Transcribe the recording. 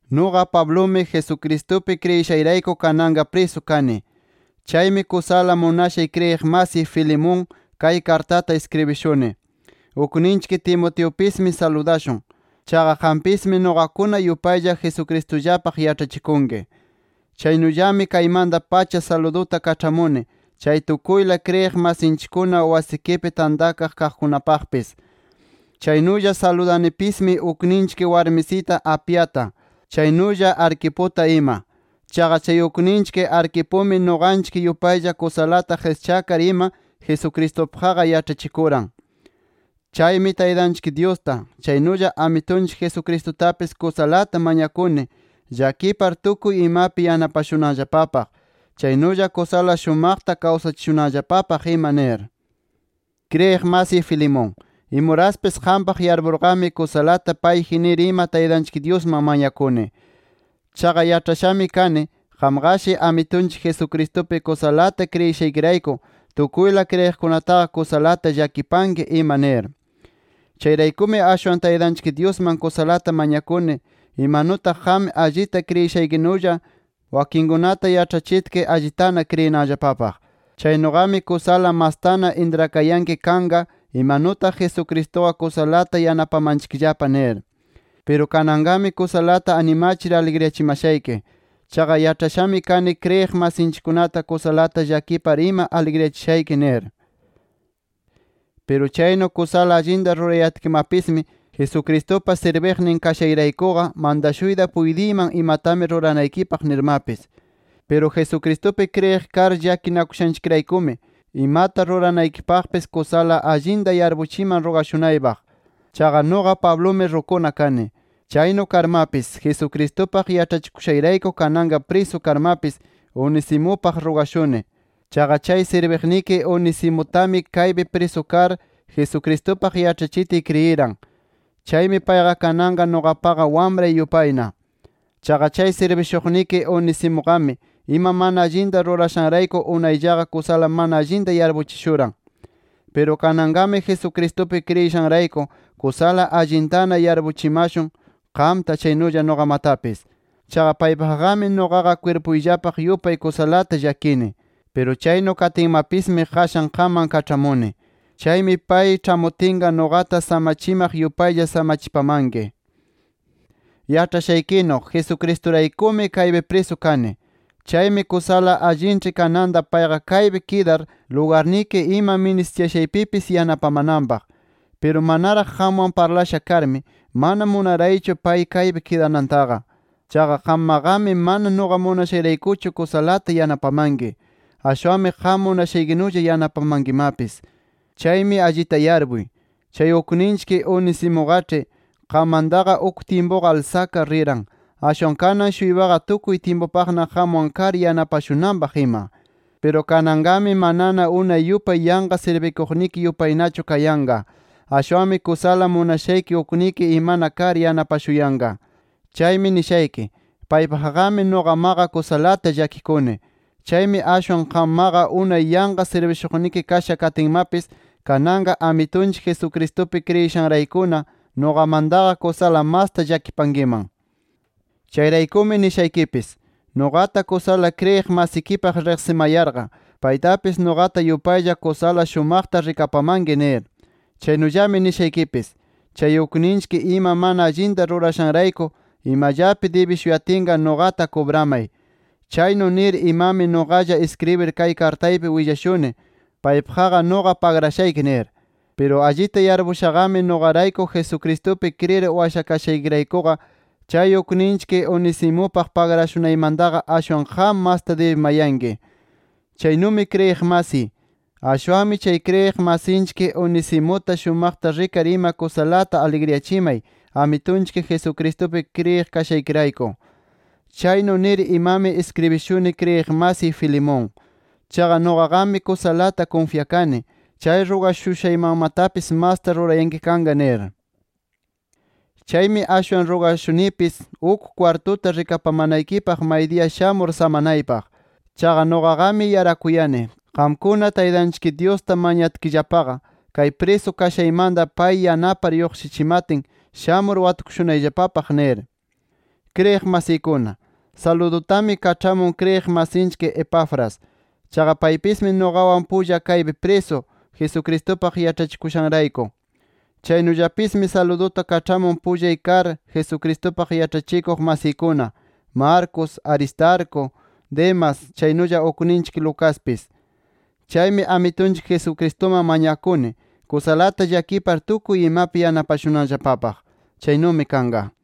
Nuqa Pablumi, Jesucristupi kriyishayrayku kananqa prisu kani. Chaymi kusala munashay kriyiq masiy Filemón, kay kartata iskribishuni. Ukninchik Timoteupismi saludashun. Chaqa qampismi nuqakuna yupaylla Jesucristullapaq yaĉhachikunki. Chaynullami kaymanta-pacha saluduta kaĉhamuni chay tukuyla kriyiq masinchikkuna wasikipi tantakaq kaqkunapaqpis. Chaynulla saludanipismi ukninchik warmisita Apiata, chaynulla Arquiputa ima. Chaqa chay ukninchik Arquipumi nuqanchik yupaylla kusalata qischakar ima Jesucristupaqqa yaĉhachikuran. Chaymi Taytanchik Dyusta, chaynulla Amitunchik Jesucristutapis kusalata mañakuni llakipar tukuy imapi yanapashunanllapapaq, chaynulla kusala shumaqta kawsachishunanllapapaq ima nir. Kriyiq masiy Filemón, imuraspis qampaq yarpurqami kusalata payji nir ima Taytanchik Dyusman mañakuni. Chaqa yaĉhashami kani, qamqashi Amitunchik Jesucristupi kusalata kriyishaykirayku tukuyla kriyiqkunataqa kusalata llakipanki ima nir. Chayraykumi ashwan Taytanchik Dyusman kusalata mañakuni imanutaq qam allita kriyishaykinulla wakinkunata yaĉhachitki allitana kriyinanllapapaq. Chaynuqami kusala mastana intrakayanki kanqa imanutaq Jesucristuqa kusalata yanapamanchikllapa nir. Piru kananqami kusalata animachir aligriyachimashayki. Chaqa yaĉhashami kani kriyiq masinchikkunata kusalata llakipar ima aligriyachishayki nir. Piru chaynu kusala allinta rurayatkimapismi, Jesucristupa sirbiqnin kashayraykuqa, mantashuyta puytiyman imatami ruranaykipaq nirmapis. Piru Jesucristupi kriyiq kar llakinakushanchikraykumi, imata ruranaykipaqpis kusala allinta yarpuchiman rugashunaypaq. Chaqa nuqa Pablumi rukuna kani. Chaynu karmapis, Jesucristupaq yaĉhachikushayrayku kananqa prisu karmapis Onesimupaq rugashuni. Chaqa chay sirbiqniki Onesimutami kaypi prisu kar Jesucristupaq yaĉhachitiy kriyiran. Chaymi payqa kananqa nuqapaqa wamray yupayna. Chaqa chay sirbishuqniki Onesimuqami ima mana allinta rurashanrayku unayllaqa kusala mana allinta yarpuchishuran. Piru kananqami Jesucristupi kriyishanrayku kusala allintana yarpuchimashun qamta chaynulla nuqamatapis. Chaqa paypaqqami nuqapa kwirpuyllapaq yupay kusalata llakini. Piru chaynu katinmapismi qashan qamman kaĉhamuni. Chaymi pay ĉhamutinqa nuqata samachimaq yupaylla samachipamanki. Yaĉhashaykinu, Jesucristuraykumi kaypi prisu kani. Chaymi kusala allinĉhi kananta payqa kaypi kidar lugarniki ima ministiyashaypipis yanapamananpaq. Piru manaraq qamwan parlasha karmi, mana munaraychu pay kaypi kidanantaqa. Chaqa qammaqami mana nuqa munashayraykuchu kusalata yanapamanki. Ashwanmi qam munashaykinulla yanapamankimapis. Chaymi allita yarpuy. Chay ukninchik Onesimuqaĉhi qammantaqa uk tyimpuqa alsakar riran, ashwan kanan-shuypaqa tukuy tyimpupaqna qamwan kar yanapashunanpaq ima. Piru kananqami manana unay yupay yanqa sirbikuqniki yupaynachu kayanqa. Ashwanmi kusala munashayki ukniki imana kar yanapashuyanqa. Chaymi nishayki: Paypaqqami nuqamaqa kusalata llakikuni. Chaymi ashwan qammaqa unay yanqa sirbishuqniki kasha katinmapis kananqa Amitunchik Jesucristupi kriyishanraykuna nuqamantaqa kusala masta llakipankiman. Chayraykumi nishaykipis: Nuqata kusala kriyiq masikipaq riqsimayarqa, paytapis nuqata yupaylla kusala shumaqta rikapamanki nir. Chaynulla nishaykipis: Chay ukninchik ima mana allinta rurashanrayku imallapi dibishuyatinqa nuqata kubramay. Chaynu nir imami nuqalla iskribir kay kartaypi willashuni, paypaqqa nuqa pagrashayki nir. Piru allita yarpushaqami nuqarayku Jesucristupi kriyir washakashaykiraykuqa, chay ukninchik Onesimupaq pagrashunaymantaqa ashwan qam masta dibimayanki. Chaynumi kriyiq masiy, ashwanmi chay kriyiq masinchik Onesimuta shumaqta rikar ima kusalata aligriyachimay, Amitunchik Jesucristupi kriyiq kashaykirayku. Chaynu nir imami iskribishuni kriyiq masiy Filemón. Chaqa nuqaqami kusalata kunfyakani, chay rugashushaymanmatapis masta rurayanki kanqa nir. Chaymi ashwan rugashunipis uk kwartuta rikapamanaykipaq maydiya shamur samanaypaq. Chaqa nuqaqami yarakuyani, qamkuna, Taytanchik Dyusta mañatkillapaqa, kay prisu kashaymanta pay yanapar lluqshichimatin, shamur watukushunayllapapaq nir. Kriyiq masiykuna, saludutami kaĉhamun kriyiq masinchik Epafras. Chaqa paypismi nuqawan pulla kaypi prisu, Jesucristupaq yaĉhachikushanrayku. Chaynullapismi saluduta kaĉhamun pullay kar Jesucristupaq yaĉhachikuq masiykuna, Marcos, Aristarco, Demas, chaynulla ukninchik Lucaspis. Chaymi Amitunchik Jesucristuman mañakuni, kusalata llakipar tukuy imapi yanapashunanllapapaq. Chaynumi kanqa.